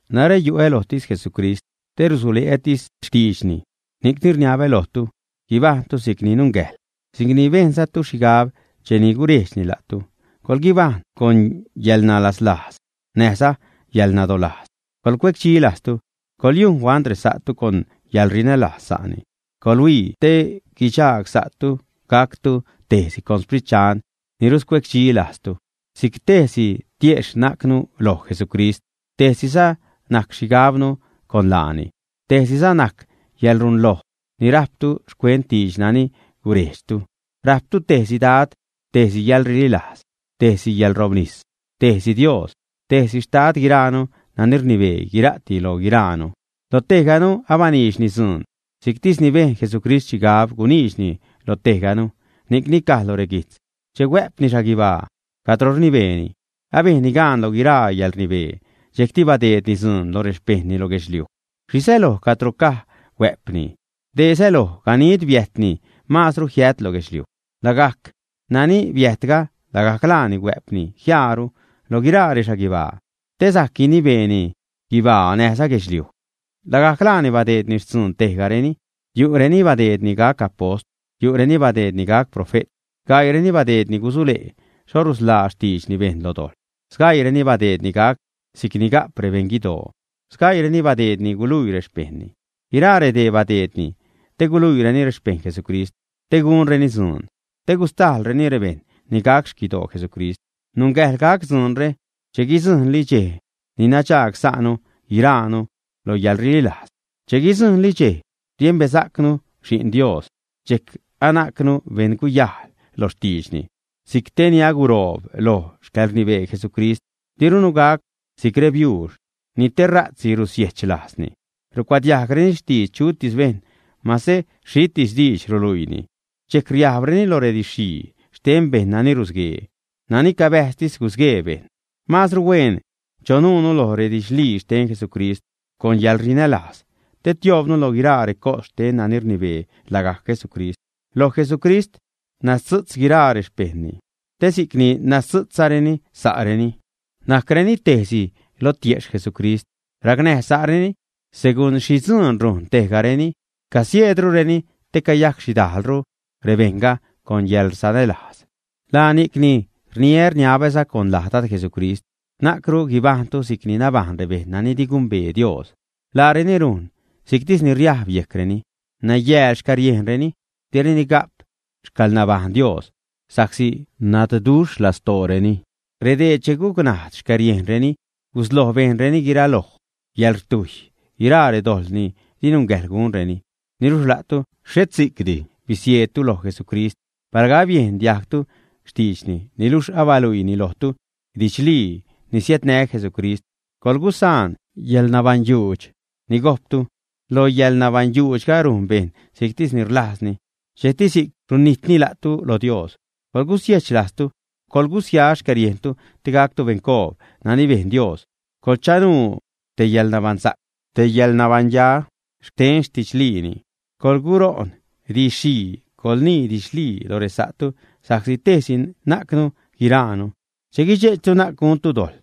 Narä yu'ä lojtis Jesucrist te rsule'ätis xtiidxni. Ni'cni rniabä lojtu, guibajṉtu si'cni nungäjḻ, si'cni bejnzatu xhigab cheni gurejdxni la'tu. Coḻguibajṉ con yäḻnalaslajz, näjza yäḻnadolajz, coḻcuecdxi lajztu. Coḻyujn huant resa'tu con yäḻrinälajz sa'ni. Coḻhuii te guidxaag sa'tu gactu tejsi con Sprit Dxan ni ruscuecdxilajztu. Si'c tejsi tiejxh najcnu loj Jesucrist, tejsiza najc xhigabnu con laani, tejsiza najc yäḻrunloj ni rajptu xcuent diidx nani gurejdxtu. Rajptu tejsi Dad, tejsi yäḻrililajz, tejsi yäḻrobnis, tejsi Dios, tejsi Xtad guiraanu nani rnibee guira'ti lo guiraanu. Lo tejganu abaniidxni dzuun si'ctis bejn Jesucrist xhigab guniidxni lo tejganu. Ni'cni caj lo reguijtz: Che huä'pni xhaguibaa, cadro rnibeeni, abejnni gaan loj guiraa yäḻrnibee, dxejcti badeedni dzuun lo rexpejṉni lo guedxliuj. ¿Xhi säloj cadro caj, “huä'pni”? Dee säloj ganid biäjtni maazru jiät lo guedxliuj. Lagajc nani biäjtga, lagajc laani huä'pni jiaaru lo guiraa rexhaguibaa te sajc guinibeeni guibaa näjza guedxliuj. Lagajc laani badeedni xtzuun tejgareni. Yu'reni badeedni gac apost, yu'reni badeedni gac profe't, gaiireni badeedni gusule' xho rusḻaa xtiidxni bejṉ lo dojḻ, sgaiireni badeedni gac si'c ni ga'p rebeṉ guidoo, sgaiireni badeedni guluii rexpejṉni. Guiraa redee badeedni te guluiireni rexpejṉ Jesucrist, te gunreni dzuun te gustajḻreni rebejṉ ni gac xquidoo Jesucrist. Nungäjḻ gac dzuunre che guidzujṉli dxej ni nadxaag-sa'nu guiraanu loj yäḻrililajz, che guidzujṉli dxej riembesa'cnu Xi'n Dios, dxejc anajcnu beṉguyajl lo xtiidxni, si'c te ni aguroob loj xcäḻrnibee Jesucrist. Dirunu gac si'c rebiuux ni tera'tsi rusiejch lajzni, rucuadiajgreni xtidx chutis bejṉ, mase xhitis diidx ruluiini. Dxejc riajbreni lo redidx-xhii xten bejṉ nani rusguee, nani cabäjztis gusguee bejṉ. Maazru hueen chonuunu loj redidxlii xten Jesucrist con yäḻrinälajz te tioobnu lo guiraa recos xten nani rnibee, lagajc Jesucrist. Loj Jesucrist nazdzu'tz guiraa rexpejṉni, te si'cni nazdzu'tzsa'reni sääreni, najcreni tejsi loj tiejxh Jesucrist, racnäj sa'reni segun xhi dzuun rujn tejgareni, casieedrureni te cayajc xhidajlru rebejṉga con yäḻsanälajz. Laa ni'cni rniä rniabäza con laj Dad Jesucrist na'cru guibajṉtu si'c nabajṉ rebejṉ nani di gumbee Dios. Laareni rujn si'ctis ni riajb yejcreni. Nayääl xcäriejnreni, direni ga'p xcäḻnabajṉ Dios sa'csi nadduxh lastooreni. Redee che gucnajd xcäriejnreni gusloj bejnreni guiraloj yäḻrtujy, guiraa redojḻ ni di nungäjḻ gunreni. Niluxh la'tu xhet si'cdi bisieedtu loj Jesucrist. Palga abiejn diajgtu xtiidxni, niluxh abaluiini lojtu didxlii ni siädnä Jesucrist, coḻgusaan yäḻnabaṉyujxh ni gojptu: Lo yäḻnabaṉyujxhga rujn bejṉ si'ctis ni rlajzni. Dxejcti si'c runijtni la'tu lo Dios. Coḻgusiejch lajztu, coḻgusia xcäriejntu, te gactu beṉcoob nani bejn Dios, coḻchanuu te yäḻnabaṉsa'c, te yäḻnabaṉya xten xtidxliini. Coḻguṟo'n diidx-xhii, coḻnii didxlii lo resa'tu sa'csi tejsi najcnu guiraanu. Che guidxe'chtu, na'c guntu dojḻ.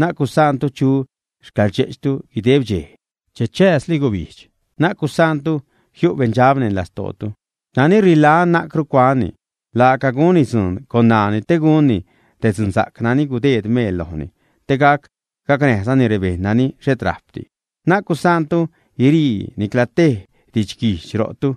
Na'c gusaantu chu xcäḻrdxe'chtu guideb dxej che chääzli gubijdx. Na'c gusaantu jiu' beṉdxab neṉ lastootu. Nani rilajn, na'cru cuanni. Laaca gunni dzuun con ṉaani te gunni te dzunsa'c nani gudeed meel lojni te gac gacnäjzani rebejṉ nani xhet rajpdi. Na'c gusaantu guirii nicla tej didxguijdx ro'tu.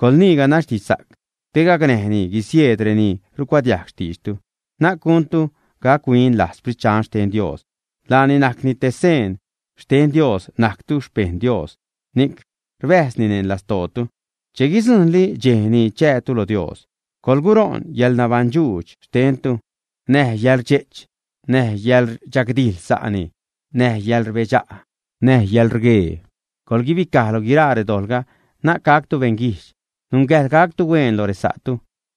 Coḻnii ganax didxsa'c te gacnäjni guisieed reni rucuadiajg xtiidxtu. Na'c guntu gac-huin lajz Sprit Dxan xten Dios. Laani najc te seen xten Dios najctu xpejṉ Dios, ni'c rbäjzni neṉ lastootu che guidzujṉli dxej ni chäätu lo Dios. Coḻguṟo'n yäḻnabaṉdxuudx xtentu, näj yäḻrdxe'ch, näj yäḻrdxagdijḻ sa'ni, näj yäḻrbedxa', näj yäḻrgue. Coḻguibicaj lo guiraa redojḻga, na'c gactu beṉguijdx. Nungäjḻ gactu huen loj resa'tu,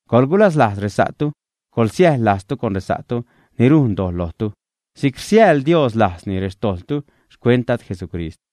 coḻgulaslajz resa'tu, coḻsiäjḻ lajztu con resa'tu ni rujn dojḻ lojtu si'c rsiäjḻ Dios lajzni rextojḻtu xcuent Dad Jesucrist.